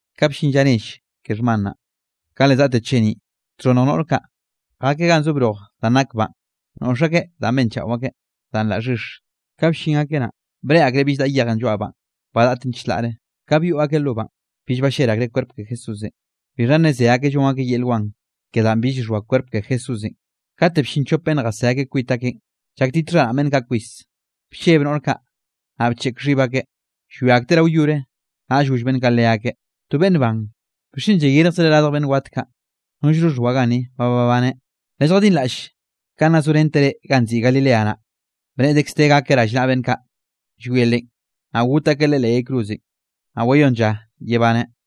Ka bllin lla nell ke xhman naꞌ, ka le zaꞌte cheniꞌ, txhonnj noꞌr kaꞌ, jakeꞌ ganꞌ zo broj danꞌ nak banꞌ, noꞌx akeꞌ danꞌ benchaꞌo akeꞌ, danꞌ la xhix. Ka bllin akeꞌ naꞌ, breꞌe akreꞌ bill daꞌa yejenꞌ lloaꞌ banꞌ, ba daꞌten chlaꞌre. Ka byoꞌ akeꞌ lo banꞌ, bill ballel akreꞌ kwerp ke Jesúsenꞌ. Bixha naꞌ ze akeꞌ llon akeꞌ yel wan ke danꞌ bill xhoa kwerp ke Jesúsenꞌ, kate bllin chop beꞌnn jasé akeꞌ kwit akeꞌn, llaktit xharaꞌn beꞌnn kaꞌ kwis. Blleb noꞌr kaꞌ, naꞌ bcheꞌk xhib akeꞌ llwia akteꞌ rao yore, naꞌll goll beꞌnn kaꞌ leakeꞌ: —To beꞌnn ban, ¿bixchen llayirjzreꞌ radj beꞌnn wat kaꞌ? Nollno xhoa ganni, ba babaneꞌ. Lelljadinraꞌll kanꞌ nna zorenteꞌ reꞌ ganꞌ nziꞌi Galilea naꞌ, bneꞌe dekz de gakeꞌ rallnaꞌa beꞌnn kaꞌ llwie Leꞌen, naꞌ got akeꞌ Leꞌe leꞌ yay cruzenꞌ, naꞌ wayónn lla yebaneꞌ.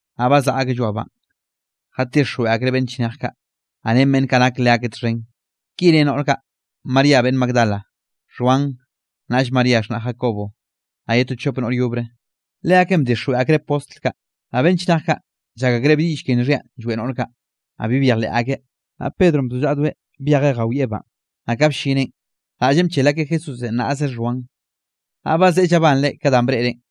Naꞌ bazaꞌa akeꞌ lloaꞌ banꞌ, jatixjweꞌ akreꞌ beꞌnn chnej kaꞌ, naꞌ ren beꞌnn kaꞌ nak leakeꞌ txhen. Ki re noꞌr kaꞌ: María beꞌnn Magdala, Xhuan, naꞌll María xhnaꞌ Jacobo, naꞌ ye to chop noꞌr yobre, leakeꞌn bdixjweꞌ akreꞌ postl kaꞌ. Naꞌ beꞌnn chnej kaꞌ, llak akreꞌ bi diꞌll ke nxhianꞌ lloeꞌ noꞌr kaꞌ, naꞌ bi byejleꞌ akeꞌ. Naꞌ Pedronꞌ bzollaꞌdoeꞌ byejeꞌ jawieꞌ banꞌ, naꞌ ka bllineꞌn, raꞌllenꞌ bchel akeꞌ Jesúsenꞌ, naꞌze xhoan, naꞌ bazeꞌe llabanreꞌ ka danꞌ breꞌreꞌn.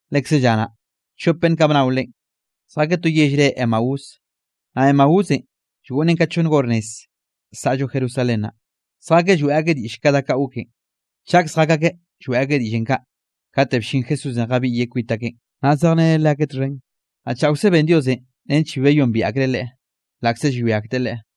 Lekze lla naꞌ, chop beꞌnn kaꞌ bnao Leꞌen, zjakeꞌ to yell re Emaús, naꞌ Emaúsenꞌ llgoꞌnnen ka chonn hor nez saꞌllo Jerusalén naꞌ. Zjakeꞌ lloeꞌ akeꞌ diꞌll ke da kaꞌ goken. Chak zjak akeꞌ lloeꞌ akeꞌ diꞌllenꞌ kaꞌ, kate bllin Jesúsenꞌ jabiꞌyeꞌ kwit akeꞌn, naꞌ zejreneꞌ leakeꞌ txhen. Naꞌ chaokze ben Diosenꞌ nench bi wayombiaꞌ akreꞌ Leꞌe, laꞌkze llwia akteꞌ Leꞌe.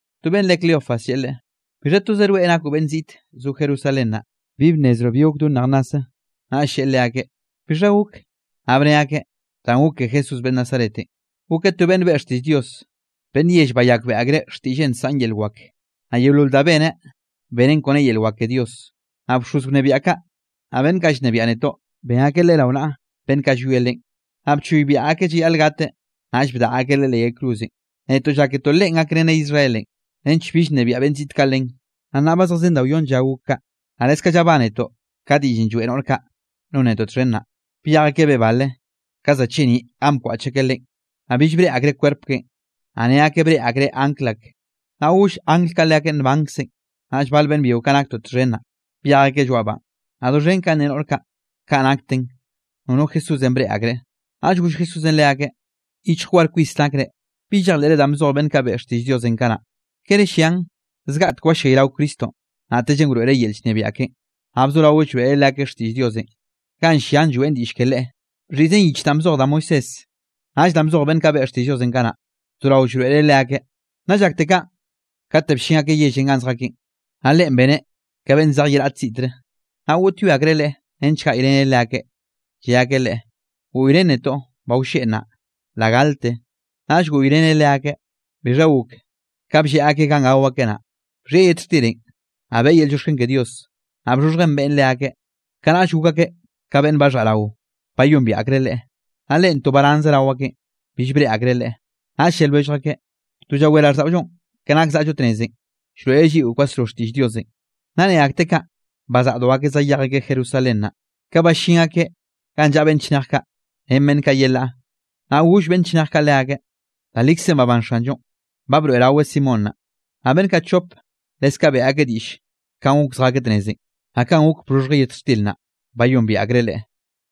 To beꞌnnenꞌ re Cleofas, lleꞌe Leꞌe: —¿Bixha tozoꞌ rweꞌ nakoꞌ beꞌnn ziꞌt zoꞌo Jerusalén naꞌ, bi bnnezroꞌ bi gok do nej nnase? Naꞌll lleꞌe leakeꞌ: —¿Bixha gok? Naꞌ bne akeꞌ: —Danꞌ gok ke Jesús beꞌnn Nazaretenꞌ, gokeꞌ to beꞌnn beꞌe xtiꞌll Dios. Beꞌnn yell bayakbeꞌe akreꞌ xtiꞌlleꞌn nsaꞌn yel wak, naꞌ yeolol danꞌ beneꞌn, beneꞌn kon ren yel wak ke Dios. Naꞌ bxoz wnebiaꞌ kaꞌ, naꞌ beꞌnn kaꞌ llnebiaꞌ netoꞌ, ben akeꞌ Leꞌe rao naꞌa beꞌnn kaꞌ llwie Leꞌen, naꞌ bchoybiaꞌ akeꞌ llayaꞌl gateꞌ, naꞌll bdaꞌa akeꞌ Leꞌe leꞌ yay cruzenꞌ. Netoꞌ lláketoꞌ Leꞌen gakreneꞌ Israelenꞌ, nench bill nnebiaꞌ beꞌnn ziꞌt kaꞌ len. Naꞌ nnaꞌ ba zejzen da wyonn lla gok kaꞌ. Naꞌ leskaꞌ llabánetoꞌ ka diꞌllenꞌ lloeꞌ noꞌr kaꞌ non netoꞌ txhen naꞌ, byej akeꞌ beꞌe bale, ka za cheniꞌ ganꞌ bkwaꞌch akeꞌ Leꞌen. Naꞌ bill breꞌe akreꞌ kwerp keꞌen, naꞌ ne akeꞌ breꞌe akreꞌ angl ak, naꞌ goll angl kaꞌ leakeꞌ nbankzeꞌn. Naꞌll bal beꞌnn byio kaꞌ naktoꞌ txhen naꞌ, byej akeꞌ lloaꞌ banꞌ, naꞌ doxhen kanꞌ ne noꞌr kaꞌ, kaꞌ nakten nono Jesúsenꞌ breꞌe akreꞌ. Naꞌll goll Jesúsenꞌ leakeꞌ: —¡Yichj war kwis nakre, bi llejleꞌre danꞌ bzoj beꞌnn kaꞌ beꞌe xtiꞌll Diosenꞌ kanaꞌ! ¿Kere llian, zgaꞌtek wallayrao Cristonꞌ, naꞌtellenꞌ wroeꞌreꞌ yel llnebiaꞌ keꞌen? Naꞌ bzorao llroeꞌreꞌ leakeꞌ xtiꞌll Diosenꞌ ganꞌ llian lloeꞌn diꞌll ke Leꞌe. Bxhiꞌzen yich danꞌ bzoj da Moisésenꞌ, naꞌll danꞌ bzoj beꞌnn kaꞌ beꞌe xtiꞌll Diosenꞌ kanaꞌ, bzorao llroeꞌreꞌ leakeꞌ. Naꞌ llakte kaꞌn, kate bllin akeꞌ yellenꞌ ganꞌ zjakeꞌn, naꞌ Leꞌen beneꞌ ka beꞌnn zej ye raꞌte ziꞌtre. Naꞌ goꞌtyoe akreꞌ Leꞌe, nench gaꞌyreneꞌ leakeꞌ, lle akeꞌ Leꞌe: —Goꞌyrén netoꞌ, ba wlleꞌ nnaꞌ, la galte. Naꞌll goꞌyreneꞌ leakeꞌ. Bixha gok, ka blleꞌ akeꞌ ganꞌ gao akeꞌ naꞌ, bxhieꞌ yet xtirenꞌ, naꞌ beꞌe yel llioxken ke Dios, naꞌ bxhoxhjeꞌn beꞌen leakeꞌ. Kanaꞌll gok akeꞌ ka beꞌnn baxhaꞌ rao, bayombiaꞌ akreꞌ Leꞌe. Naꞌ Leꞌen to baranzeꞌ rao akeꞌn, bill breꞌe akreꞌ Leꞌe. Naꞌll lle lwellj akeꞌ: —To llawé raꞌlldaꞌollonꞌ ke nak zaꞌllo tnezenꞌ, llroeꞌreꞌ lliꞌo kwasro xtiꞌll Diosenꞌ. Naꞌ ne akteꞌ kaꞌ bazaꞌdo akeꞌ zayej akeꞌ Jerusalén naꞌ, kaꞌ ballín akeꞌ ganꞌ llaꞌa beꞌnn chnej kaꞌ, ren beꞌnn kaꞌ yelaꞌ. Naꞌ goll beꞌnn chnej kaꞌ leakeꞌ: —Da likzenꞌ babán Xanllonꞌ, ba broeꞌraweꞌ Simón naꞌ. Naꞌ beꞌnn kaꞌ chop, leskaꞌ beꞌe akeꞌ diꞌll kanꞌ gok zjakeꞌ tnezenꞌ, naꞌ kanꞌ gok ka bxhoxhjeꞌ yet xtir naꞌ, bayombiaꞌ akreꞌ Leꞌe.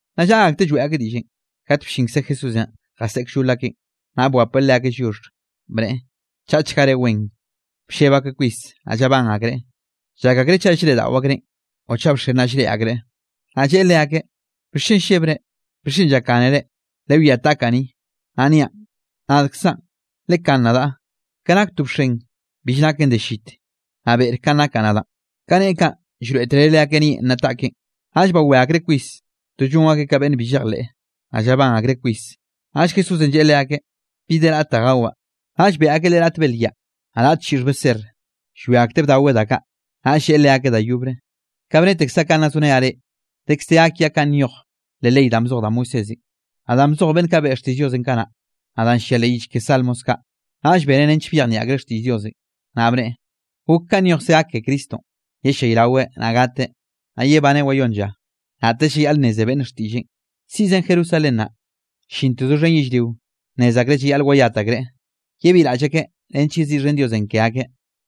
Naꞌ llaꞌa akteꞌ lloeꞌ akeꞌ diꞌllenꞌ, kate bllinkze Jesúsenꞌ jaseꞌe kllol akeꞌn, naꞌ bwapeꞌ leakeꞌ lliox, bneꞌe: —Chaꞌchga reꞌ wen. Blleb akeꞌ kwis, naꞌ llabán akreꞌ, llak akreꞌ chaꞌ llreꞌdaꞌo akreꞌn o chaꞌ bxen naꞌ llreꞌe akreꞌ. Naꞌ lleꞌe leakeꞌ: —¿Bixchen llebre? ¿Bixchen llakgánere? Lewiá taꞌkaꞌ ni, naꞌ niaꞌn, nadkzaꞌn. Lekán nadaꞌ, ke nak to bxen, bill naken de llit, naꞌ beꞌre kanꞌ nakaꞌ nadaꞌn. Ka neꞌe kaꞌn, llroeꞌtereꞌ leakeꞌ nieꞌn naꞌ taꞌkeꞌn. Naꞌll bawé akreꞌ kwis, to llon akeꞌ ka beꞌnn bi llejleꞌ, naꞌ llabán akreꞌ kwis, naꞌll Jesúsenꞌ lleꞌe leakeꞌ: —¿Bi de raꞌt da gawaꞌ? Naꞌll beꞌe akeꞌ Leꞌe raꞌt belyaꞌ, naꞌ raꞌt chiꞌxh beser. Llwia akteꞌ bdaweꞌ da kaꞌ. Naꞌll lleꞌe leakeꞌ da yobre: —Kaꞌ bnetekzaꞌ kanꞌ nna zorenaꞌ reꞌ, dekz de gak kiaꞌ kanꞌ nyoj leꞌ ley danꞌ bzoj da Moisésenꞌ, naꞌ danꞌ bzoj beꞌnn kaꞌ beꞌe xtiꞌll Diosenꞌ kanaꞌ, naꞌ danꞌ llia leꞌ yich ke Salmos kaꞌ. Naꞌll beneꞌ nench byejnieꞌ akreꞌ xtiꞌll Diosenꞌ. Naꞌ bneꞌe: —Gok kanꞌ nyojkze gak ke Cristonꞌ, yellayraweꞌ, naꞌ gateꞌ, naꞌ yebaneꞌ wayónn lla. Naꞌtellenꞌ llayaꞌl nneze beꞌnne xtiꞌlleꞌn, siꞌzen Jerusalén naꞌ, llinte doxhen yellrio nnez akreꞌ llayaꞌl wayat akreꞌ, yebiꞌraꞌll akeꞌ nench yeziꞌxhen Diosenꞌ ke akeꞌ.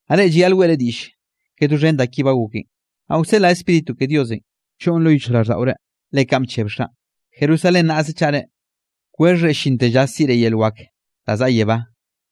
Naꞌ reꞌ llayaꞌl weꞌre diꞌll ke doxhen da ki ba goken. Naꞌ wseꞌlaꞌ Spíritu ke Diosenꞌ, choꞌn lo yichjraꞌlldaꞌore, le kaꞌn bcheb Xaꞌn. Jerusalén naꞌze chaꞌre, kwexhre llinte lla siꞌre yel wak da zaꞌa yebá.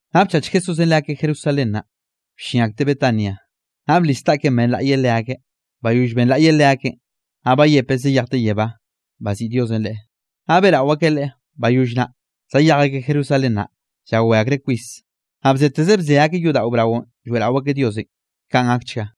Naꞌ bchach Jesúsenꞌ leakeꞌ Jerusalén naꞌ, bllin akteꞌ Betania, naꞌ blis taꞌkeꞌn benlaꞌyeꞌ leakeꞌ. Bayoll benlaꞌyeꞌ leakeꞌn, naꞌ bayepeꞌ zayejteꞌ yebá, baziꞌi Diosenꞌ Leꞌe. Naꞌ beꞌrao akeꞌ Leꞌe. Bayoll naꞌ, zayej akeꞌ Jerusalén naꞌ, llawé akreꞌ kwis. Naꞌ bzeteze bze akeꞌ yodaꞌo braonꞌ lloeꞌrao akeꞌ Diosenꞌ. Kaꞌn gakchga.